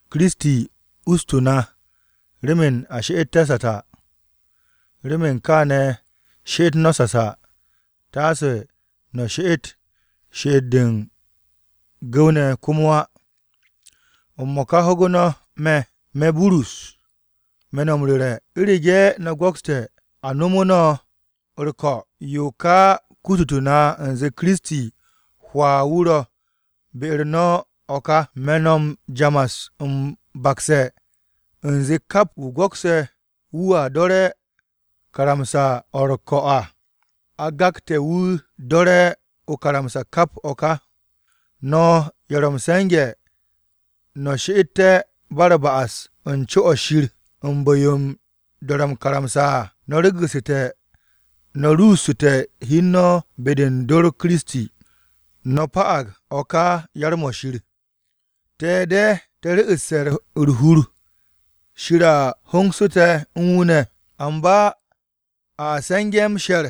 Kiristi ustu̱ na remen a she'etté̱ sasa. Remen kaane̱ she'et no̱ sasa, taase no̱ she'et she'et-de u̱n gu̱w-ne̱ komo á. M-mo̱ka ho̱gu̱ no̱ me̱. Me̱, Burus, me̱ no̱ m-ru̱re̱, u̱rege̱ no̱ go̱kste̱ a nomu̱ no̱ u̱r-ko̱, yo ka kututu̱ na u̱nze Kiristi hwaa wu̱ ro̱ be-u̱r no̱ o̱ ka. Me̱ no̱ jamas m-bakse̱ u̱nze kap wu̱ go̱kse̱ wu̱a do̱re̱ karamsa-o̱ u̱r-ko̱ à, a gakte̱ wu̱ do̱re̱ o-karamsa kap o̱ ka. No̱ ye̱ ro̱ m-se̱nge̱ no̱ she'ette̱ ba u̱r-ba'as u̱n co-o̱ Shir u̱n bu̱-yo m-do̱re̱ o-karamsa à, no̱ regu̱ssu̱te̱ no̱ ruussu̱te̱ hi u̱n no̱ be-de u̱n dor Kiristi. No̱ pa'ag o̱ ka yar-mo̱ Shir. Te̱ de̱ te̱ ru̱'u̱sse̱ u̱r-hur Shir a hongse̱ te̱ u̱n wu̱ ne̱, Amba a se̱nge̱ m-she̱r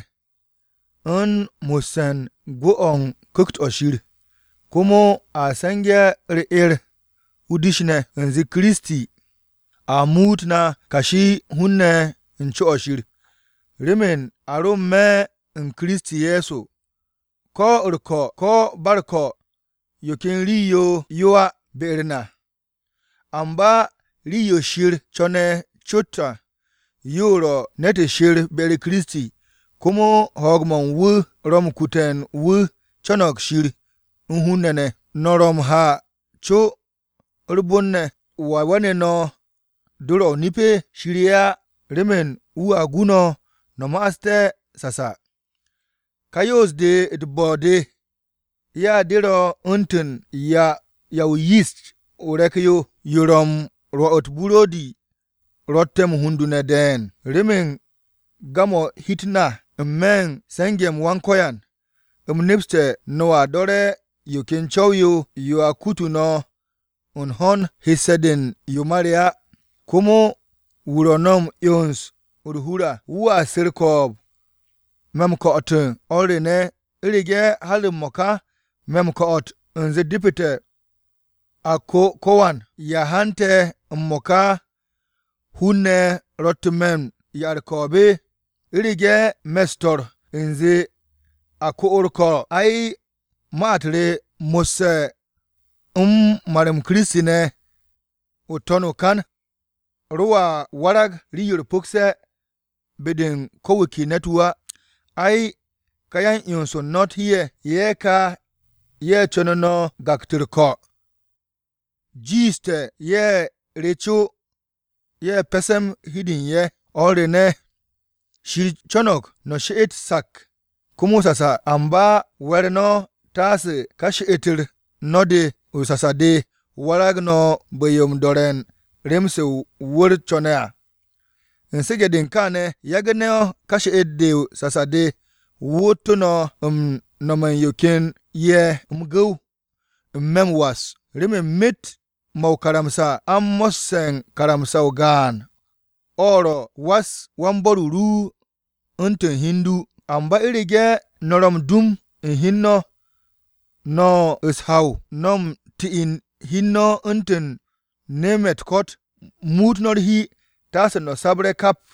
u̱n mo̱sse̱ u̱n gwu̱-o̱ u̱n Ku̱kt-o̱ Shir. Komo a se̱nge̱ u̱r-'er o-dish ne̱, u̱nze Kiristi a muut na kashi u̱n hun-ne̱ u̱n co-o̱ Shir. Remen a ro n-me̱ u̱n Kiristi Ye̱so, ko̱ u̱r-ko̱ ko̱ ba u̱r-ko̱ yo ken rii-yo yo á be-u̱r na. Amba rii-yo Shir co̱ne̱ cot à yo ro̱ ne̱t she̱r be-u̱r Kiristi, komo ho̱o̱g-mo̱ u̱n wu̱ ro̱ m-kute̱ wu̱ co̱no̱g Shir u̱n hun-ne̱ ne̱. No̱ ro m-ha co u̱r-bon ne̱, ¿Wa we̱nu̱ no̱ dor-o̱ o-nip? Shir ye̱ á, remen wu̱a gu no̱ no̱ ma'aste̱ sasa. Ka yoos-de u̱t-bo̱ de ya de ro̱ u̱ntu̱n “Ya o-yist o-re̱k yo, yo ro̱ m-rwo̱ u̱t-buro̱di ro̱tte̱ m-hundunde̱ de̱e̱n.” Remen gam-o̱ hi-u̱t na n-me̱ u̱n se̱nge̱-m Wan-Ko̱yan, u̱m nepse̱ no̱a do̱re̱ yo ken co̱w-yo yo a kutu no̱ u̱n ho̱n hesse̱-de u̱n yo ma re á. Komo wu̱ ro̱ no̱ m-'yons u̱r-hur à wu̱a su̱ u̱r-ko̱o̱b ko̱ wan wu̱. O̱r re ne̱, u̱rege̱ har m-mo̱ka me̱ m-ko̱'o̱t u̱nze depete̱ a ko ko̱wan, ¿ya hante̱ m-mo̱ka hun-ne̱ ro̱ttu̱ me̱ m-'ya u̱r-ko̱o̱b? U̱rege̱ me̱ u̱s-to̱r u̱nze a ko u̱r-ko̱, ai, ma-u̱t re mo̱sse̱ u̱n mar-m Kiristi ne̱ n-to̱n o-kan, ro a warag rii-yo u̱r-pu̱kse̱ be-de u̱n ko̱ wu̱ ke ne̱t-wu̱ á! Ay, ka yan-'yons u̱n no̱ u̱t-hi ye̱, ye̱ ka ye̱ co̱nu̱ no̱ gaktu̱ u̱r-ko̱ à, jiishte̱ ye̱ re co ye̱ pe̱se̱m hi u̱n de u̱n ye̱! O̱r re ne̱, Shir co̱no̱g no̱ she'et sak komo sasa. Amba we̱r no̱ taase ka she'et-u̱r no̱ de o-sasa de warag no̱ bu̱-yo u̱n do̱re̱ u̱n rem-se wu̱r-o co̱ne̱ à. U̱n su̱ge̱-de u̱n kaane̱, yagu̱ no̱ ka she'et-de o-sasa de wootu̱ no̱ u̱n nome̱ u̱n ye̱ ken ye̱ m-gu̱w n-me̱ m-was. Remen myet-mo̱ o-karamsa a u̱n mo̱sse̱ u̱n karamsa-o gaan, o̱ ro̱, “Was wan-bo̱r-o ru u̱ntu̱n hi u̱n du.” Amba u̱rege̱ no̱ ro̱ m-dum u̱n hi u̱n no̱, no̱ u̱s-haw, no̱ u̱n ti'in hi u̱n no̱ u̱ntu̱n nem-ye̱ o-ko̱t, muut no̱ u̱r-hi, taase no̱ sabre̱ kap!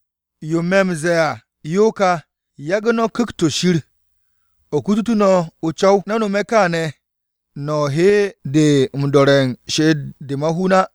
Yo me̱ m-ze̱e̱ à yo ka, yagu̱ no̱ Ku̱kt-o̱ Shir o̱ kututu̱ no̱ o-co̱w. No̱ nome̱ kaane̱ no̱ hede m-do̱re̱ u̱n she'et-de ma-hun á.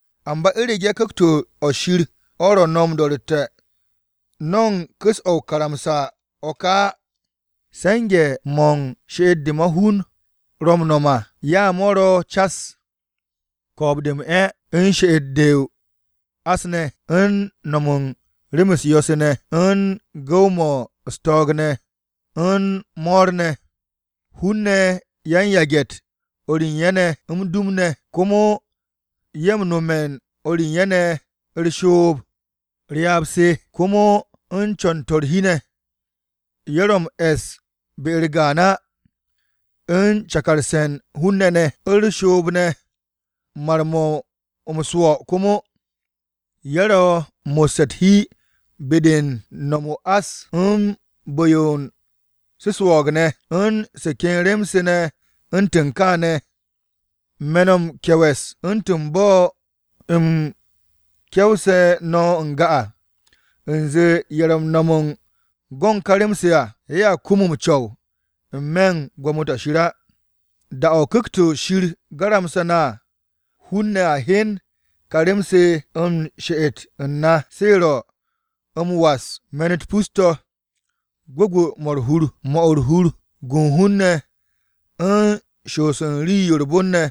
Amba u̱rege̱ Ku̱kt-o̱ Shir o̱ ro̱ no̱ m-do̱ro̱tte̱, no̱ u̱n ku̱s-o̱ o-karamsa o̱ ka á. Se̱nge̱-mo̱ she'et-de ma-hun ro̱ m-no̱m à, ya mo̱ ro̱ cas: Ko̱o̱b-de m-'e̱, u̱n She'et-de o-ás ne̱, u̱n No̱m u̱n rem u̱s-yo̱-se ne̱, u̱n Gu̱w-mo̱ u̱s-to̱o̱g ne̱, u̱n Mo̱r-ne̱, Hun-ne̱ yan-yage̱-u̱t o̱r u̱n ye̱ ne̱ m-dum ne̱, komo, Ye̱ m-nome̱ u̱n o̱r u̱n ye̱ ne̱ u̱r-shoob, Ryaab-se, komo u̱n Co̱n-to̱ u̱r-hi ne̱, Ye̱ ro̱ m-e̱s be-u̱r gaan á, u̱n Cakarse̱ u̱n hun-ne̱ ne̱, U̱r-shoob ne̱, Mar-mo̱ m-swo̱ komo, Ye̱ ro̱ u̱n mo̱sse̱ u̱t-hi be-de m-no̱m o-ás u̱n bu̱-yo u̱n su̱ swo̱o̱g ne̱, u̱n Se ken rem-se ne̱ u̱ntu̱n kaane̱. Me̱ no̱ m-ke̱we̱s, u̱ntu̱n bo̱ u̱m ke̱wse̱ no̱ n-ga à, u̱nze ye̱ ro̱ m-no̱m u̱n go̱ u̱n ka rem-se à, ye̱a kum m-co̱w n-me̱ u̱n Gwo̱mo-to̱ Shir á. Da-o̱ Ku̱kt-o̱ Shir garamse̱ na à, hun-ne̱ a hyen ka rem-se u̱n she'et u̱n na, se ro̱: m-was, me̱n-u̱t pus-to̱, gwu̱gwu̱-mo̱ u̱r-hur, 'mo̱ u̱r-hur, gu u̱n hun-ne̱, u̱n shoos u̱n rii-yo u̱r-bon ne̱,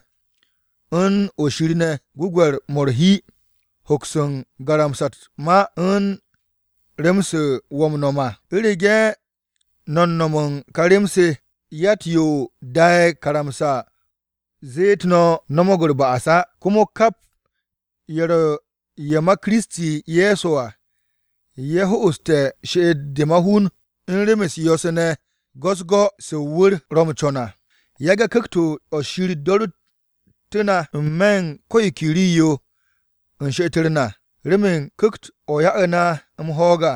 u̱n o̱ shir ne̱, gwu̱gwe̱r-mo̱ u̱r-hi, hoks m-garamsa u̱t-ma u̱n rem-se wo̱ m-nom à. U̱rege̱ no̱ no̱m u̱n ka rem-se, yatt-yo da'e̱ karamsa-o̱ zet no̱ no̱mo̱g u̱r-ba'as á. Komo kap ye̱ ro̱ ye̱ ma Kiristi Ye̱so à, ye̱ ho'oste̱ she'et-de ma-hun u̱n rem-u̱s yo̱-se ne̱ go̱-u̱s-go̱ se wu̱r-o ro̱ m-co̱n à. Yage̱ Ku̱kt-o̱ Shir do̱ru̱ttu̱ na n-me̱ u̱n ko̱ yo ke rii-yo u̱n she'et-u̱r na, remen Ku̱kt-o̱ ya'u̱ na m-ho̱o̱g à.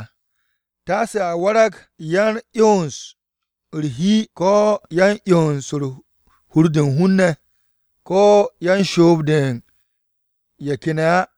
Taase a warag yan-'yons u̱r-hi ko̱ yan-'yons u̱n hur-de u̱n hun-ne̱, ko̱ yan-shoob-de u̱n ye̱ ken ya á.